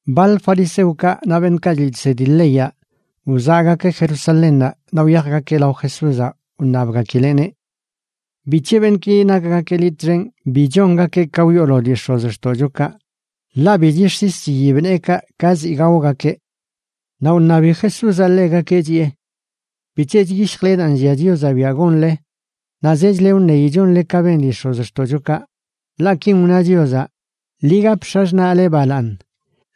Baḻ fariseokaꞌ naꞌ beṉꞌkaꞌ chliꞌ chsedi leyaꞌ, wzaꞌgakeꞌ Jerusalénnaꞌ naꞌ wyajgakeꞌ lao Jesúzaꞌ, wṉabgakileꞌneꞌ: ―¿Bic̱he beṉꞌki nakgakeꞌ liꞌ txen bi chongakeꞌ ka wyoolo dii x̱ozxtoꞌchokaꞌ? Ḻaꞌ bi chix̱is chiyib neekaꞌ ka ziꞌ gaogakeꞌ. Naꞌ wṉabi Jesúzaꞌ ḻegakeꞌ chiꞌe: ―¿Bic̱he chyishjle daa nllia Chiozaꞌ biaꞌ gonle naꞌ zechle wṉeyi chonle ka ben dii x̱ozxtoꞌchokaꞌ? Ḻaꞌ kin wna Chiozaꞌ: “Ḻi gap x̱axṉaꞌle balaaṉ”,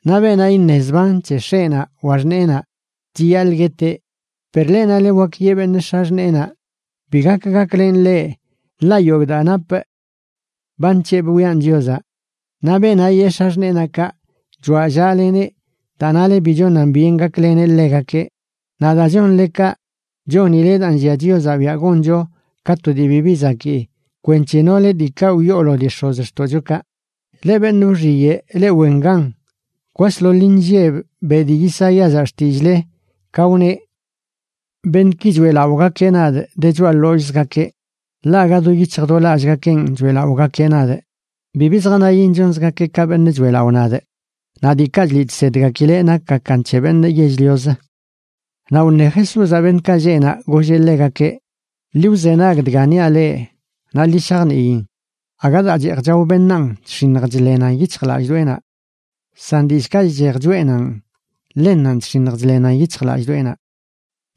naꞌ “Beenaꞌ iṉe zban c̱he x̱eꞌnaꞌ wa xṉeenaꞌ, chiyaḻꞌ gueteꞌ.” Per leꞌ, nale wak yeꞌ beṉꞌ x̱axṉeenaꞌ: “Bi gak gaklenꞌ leꞌ, ḻaꞌ yogꞌ daa napꞌ ba nc̱hebꞌ wiꞌan Chiozaꞌ.” Naꞌ beenaꞌ yee x̱axṉeenaꞌ kaꞌ, choꞌallaleneꞌ daa nale bi chonan byen gakleneꞌ ḻegakeꞌ. Naꞌ daa chonle kaꞌ, chonile daa nllia Chiozaꞌ biaꞌ goncho ka to dii bibi zakii kwenc̱he nole diikaꞌ wyoolo dii x̱ozxtoꞌchokaꞌ. ¡Leꞌ beṉꞌ wxiyeꞌ, leꞌ wen gan! Kwasḻoḻ inlleb beꞌ dii Isaíazaꞌ xtillꞌle, ka wneꞌ: Beṉꞌki choeꞌlaꞌogakeꞌ nadꞌ de choꞌa ḻollꞌzgakeꞌ, ḻaꞌ aga do yic̱hj do lallꞌgakenꞌ choeꞌlaꞌogakeꞌ nadꞌ. Bibi zjanayin chonzgakeꞌ ka beṉꞌ choeꞌlaꞌo nadꞌ; naꞌ diikaꞌ chliꞌ chsedgakileꞌ nakgakan c̱he beṉꞌ yell-lioz. Naꞌ wṉe Jesúzaꞌ beṉꞌkaꞌ lleꞌ naꞌ, golleꞌ ḻegakeꞌ: ―Ḻi wzenag dga iṉiaꞌ leꞌ naꞌ ḻi shajniin. Aga daa cheej chao beṉaan chx̱iṉj chḻenan yic̱hjlallꞌdoꞌenaꞌ, san dillꞌkaꞌ chchej choꞌenanꞌ, ḻennanꞌ chx̱iṉj chḻenan yic̱hjlallꞌdoꞌenaꞌ.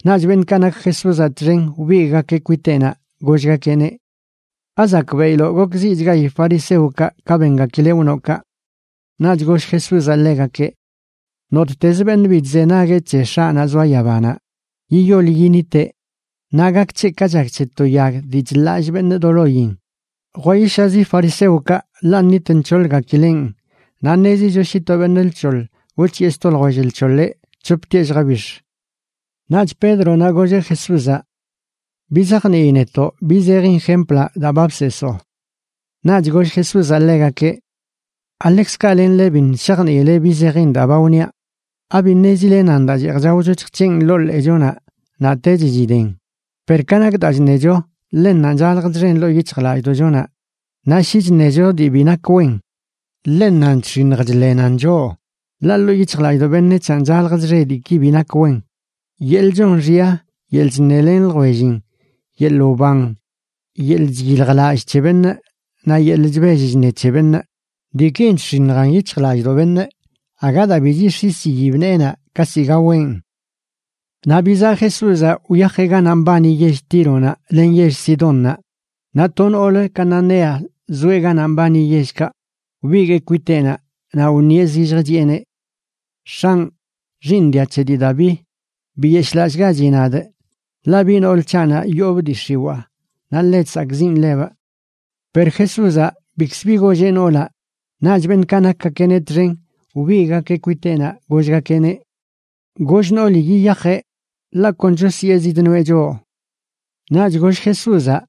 Naꞌch beṉꞌkaꞌ nak Jesúzaꞌ txen wbigꞌgakeꞌ kwiteꞌnaꞌ, gollgakeꞌneꞌ: ―¿Azakbeꞌiloꞌ gokziꞌchgayi fariseokaꞌ ka bengakileꞌ wnoꞌ kaꞌ? Naꞌch goll Jesúzaꞌ ḻegakeꞌ: ―Nottezə beṉꞌ bi chzenagueꞌ c̱he X̱aꞌnaꞌ zoa yabanaꞌ, yiyol yiniteꞌ, naꞌ gak c̱heꞌ ka chak c̱he to yag dii chḻallꞌ beṉꞌ do loyin. Jwayishazi fariseokaꞌ, ḻaꞌ nnit nc̱hoḻgakilenꞌ. Naꞌ ṉezicho shi to beṉꞌ lc̱hoḻ wc̱hiꞌe sto ljwell lc̱hoḻeꞌ, c̱hoptieꞌ lljabix̱. Naꞌch Pédronaꞌ golleꞌ Jesúzaꞌ: ―Bizajnii netoꞌ bi zejin jemplaꞌ daa ba bseesoo. Naꞌch goll Jesúzaꞌ ḻegakeꞌ: ―¿Aḻekzkaꞌ lenle biṉꞌ shajniile bi zejin daa ba wniaꞌ? ¿Abi ṉezile nan daa cheej chaocho chjc̱heꞌn ḻoo ḻeechonaꞌ naꞌtech chiden? Per ka nak daa chṉecho, ḻennanꞌ chalj chxen ḻoo yic̱hjlallꞌdoꞌchonaꞌ. Naꞌ shi chṉecho dii bi nak wen, ḻennanꞌ chx̱iṉj chḻenan choꞌ. Ḻaꞌ ḻoo yic̱hjlallꞌdoꞌ beṉec̱hanꞌ chalj chxe diiki bi nak wen: yeḻꞌ chon xya, yeḻꞌ chṉelen ljwellin, yeḻꞌ wban, yeḻꞌ chyiljlallꞌ c̱he beṉꞌ, naꞌ yeḻꞌ chbell chṉe c̱he beṉꞌ. Diikin chx̱iṉjan yic̱hjlallꞌdoꞌ beṉꞌ, aga daa bi chix̱is chiyib neenaꞌ ka ziꞌ gawenꞌ. Naꞌ bizaꞌ Jesúzaꞌ wyajeꞌ ganaꞌ mbani yell Tíronaꞌ len yell Sidónnaꞌ. Naꞌ to noolə cananea zoeꞌ ganaꞌ mbani yellkaꞌ wbigueꞌ kwiteꞌnaꞌ naꞌ wṉieꞌ zilljə, chiꞌeneꞌ: ―X̱anꞌ, Xiiṉ dia c̱he dii Daví, biyeshꞌlallꞌgachi nadꞌ, ḻaꞌ biꞌ nool c̱haꞌnaꞌ yoobꞌ dii x̱iwaa naꞌ ḻe chsakꞌziꞌn ḻebꞌ. Per Jesúzaꞌ bikzə bi golleꞌ noolaꞌ. Naꞌch beṉꞌkaꞌ nakgakeꞌneꞌ txen wbigꞌgakeꞌ kwiteꞌnaꞌ gollgakeꞌneꞌ: ―Goll nooli yiyajeꞌ, ḻaꞌ kon chosyee zidnoeꞌ choꞌ. Naꞌch goll Jesúzaꞌ: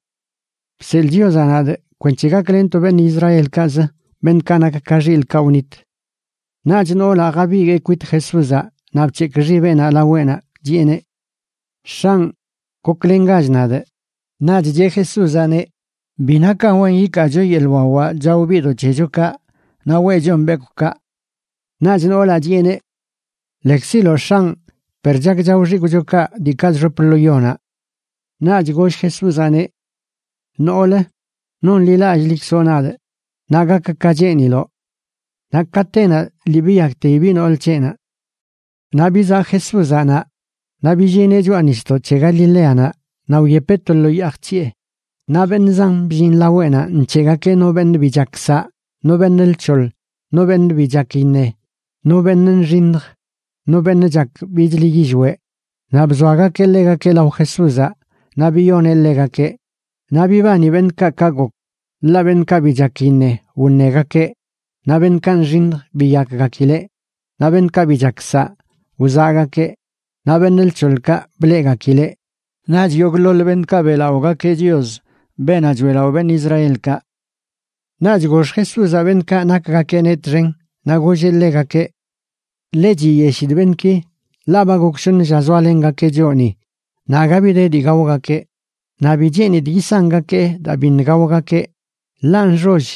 ―Bseḻꞌ Chiozaꞌ nadꞌ kwenc̱he gaklenꞌ to beṉꞌ Israelkaꞌzə, beṉꞌkaꞌ nak ka xilꞌkaꞌ wnit. Naꞌch noolaꞌ jabiguee kwit Jesúzaꞌ naꞌ bc̱hekꞌ xibeꞌnaꞌ laweꞌnaꞌ chiꞌeneꞌ: ―¡X̱anꞌ, goklengach nadꞌ! Naꞌch cheꞌ Jesúzaꞌneꞌ: ―Bi nakan wen yikaacho yeḻꞌ wawaꞌ chao biꞌdoꞌ c̱hechokaꞌ naꞌ weꞌchon bekwꞌkaꞌ. Naꞌch noolaꞌ chiꞌeneꞌ: ―Lekziloꞌ, X̱anꞌ, per chak chao xikwꞌchokaꞌ diikaꞌ chxop lo yonaꞌ. Naꞌch goll Jesúzaꞌneꞌ: ―¡Noolə, nonḻilallꞌlikzoꞌ nadꞌ! Naꞌ gak ka cheeniloꞌ. Naꞌ katenaꞌ lii biyakteyi biꞌ nool c̱heꞌnaꞌ. Naꞌ bizaꞌ Jesúzaꞌ naꞌ, naꞌ billineꞌ choꞌa nisdoꞌ c̱he Galileanaꞌ naꞌ wyepeꞌ to lo yaa jc̱hiꞌe. Naꞌ beṉꞌ zan bllin laweꞌnaꞌ nc̱heꞌgakeꞌ no beṉꞌ bi chak saꞌ, no beṉꞌ lc̱hoḻ, no beṉꞌ bi chak iṉe, no beṉꞌ nxiṉj, no beṉꞌ chak bichlə yillweꞌ. Naꞌ bzoagakeꞌ ḻegakeꞌ lao Jesúzaꞌ naꞌ biyoneꞌ ḻegakeꞌ. Naꞌ bibani beṉꞌkaꞌ ka gok, ḻaꞌ beṉꞌkaꞌ bi chak iṉe wṉegakeꞌ, naꞌ beṉꞌkaꞌ nxiṉj biyakgakileꞌ, naꞌ beṉꞌkaꞌ bi chak saꞌ wzaꞌgakeꞌ, naꞌ beṉꞌ lc̱hoḻkaꞌ bleꞌgakileꞌ. Naꞌch yogꞌḻoḻ beṉꞌkaꞌ beꞌlaꞌogakeꞌ Chios, beenaꞌ choeꞌlaꞌo beṉꞌ Israelkaꞌ. Naꞌch gox Jesúzaꞌ beṉꞌkaꞌ nakgakeꞌneꞌ txen, naꞌ golleꞌ ḻegakeꞌ: ―Ḻe chiyeshidꞌ beṉꞌki, ḻaꞌ ba gok shoṉ lla zoalengakeꞌ choꞌ ni, naꞌ aga bi de dii gaogakeꞌ. Naꞌ bi cheenidꞌ yisangakee daa biṉꞌ gaogakeꞌ, ḻaꞌ nxoll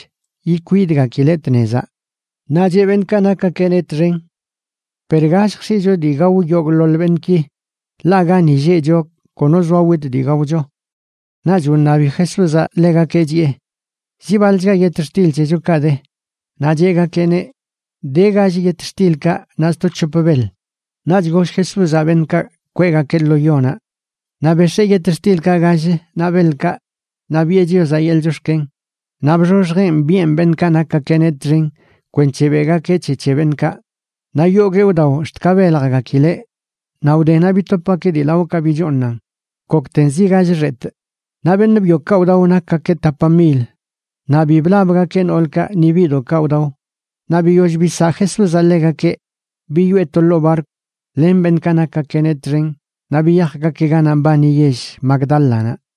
ikwidgakileꞌ tnezaꞌ. Naꞌ cheꞌ beṉꞌkaꞌ nakgakeꞌneꞌ txen: ―Per ¿ga lljx̱iꞌcho dii gao yogꞌḻoḻ beṉꞌki?, ḻaꞌ gani lleꞌcho kono zoa witꞌ dii gaocho. Naꞌch wṉabi Jesúzaꞌ ḻegakeꞌ, chiꞌe: ―¿Zi baḻchga yetxtil c̱hechokaꞌ de? Naꞌ cheꞌgakeꞌneꞌ: ―De gall yetxtilkaꞌ naꞌ sto c̱hop beḻ. Naꞌch goll Jesúzaꞌ beṉꞌkaꞌ kweꞌgakeꞌ lo yonaꞌ. Naꞌ bex̱ee yetxtilkaꞌ gall naꞌ beḻkaꞌ naꞌ biꞌe Chiozaꞌ yeḻꞌ chox̱ken, naꞌ bxoxjeꞌn biꞌen beṉꞌkaꞌ nakgakeꞌneꞌ txen kwenc̱he beꞌgakeꞌ c̱he c̱he beṉꞌkaꞌ. Naꞌ yoguee wdao ax̱t ka beljgakileꞌ. Naꞌ wdenaꞌ bitopgakeꞌ dii laoꞌkaꞌ bichooṉan, gokten zi gall xetꞌ. Naꞌ beṉꞌ byokaꞌ wdao nakgakeꞌ tapa mil, naꞌ bi blabgakeꞌ noolkaꞌ ni biꞌdoꞌkaꞌ wdao. Naꞌ biyoll bisaꞌ Jesúzaꞌ ḻegakeꞌ, biyoꞌe to ḻoo barkw len beṉꞌkaꞌ nakgakeꞌneꞌ txen naꞌ biyajgakeꞌ ganaꞌ mbani yell Magdálanaꞌ.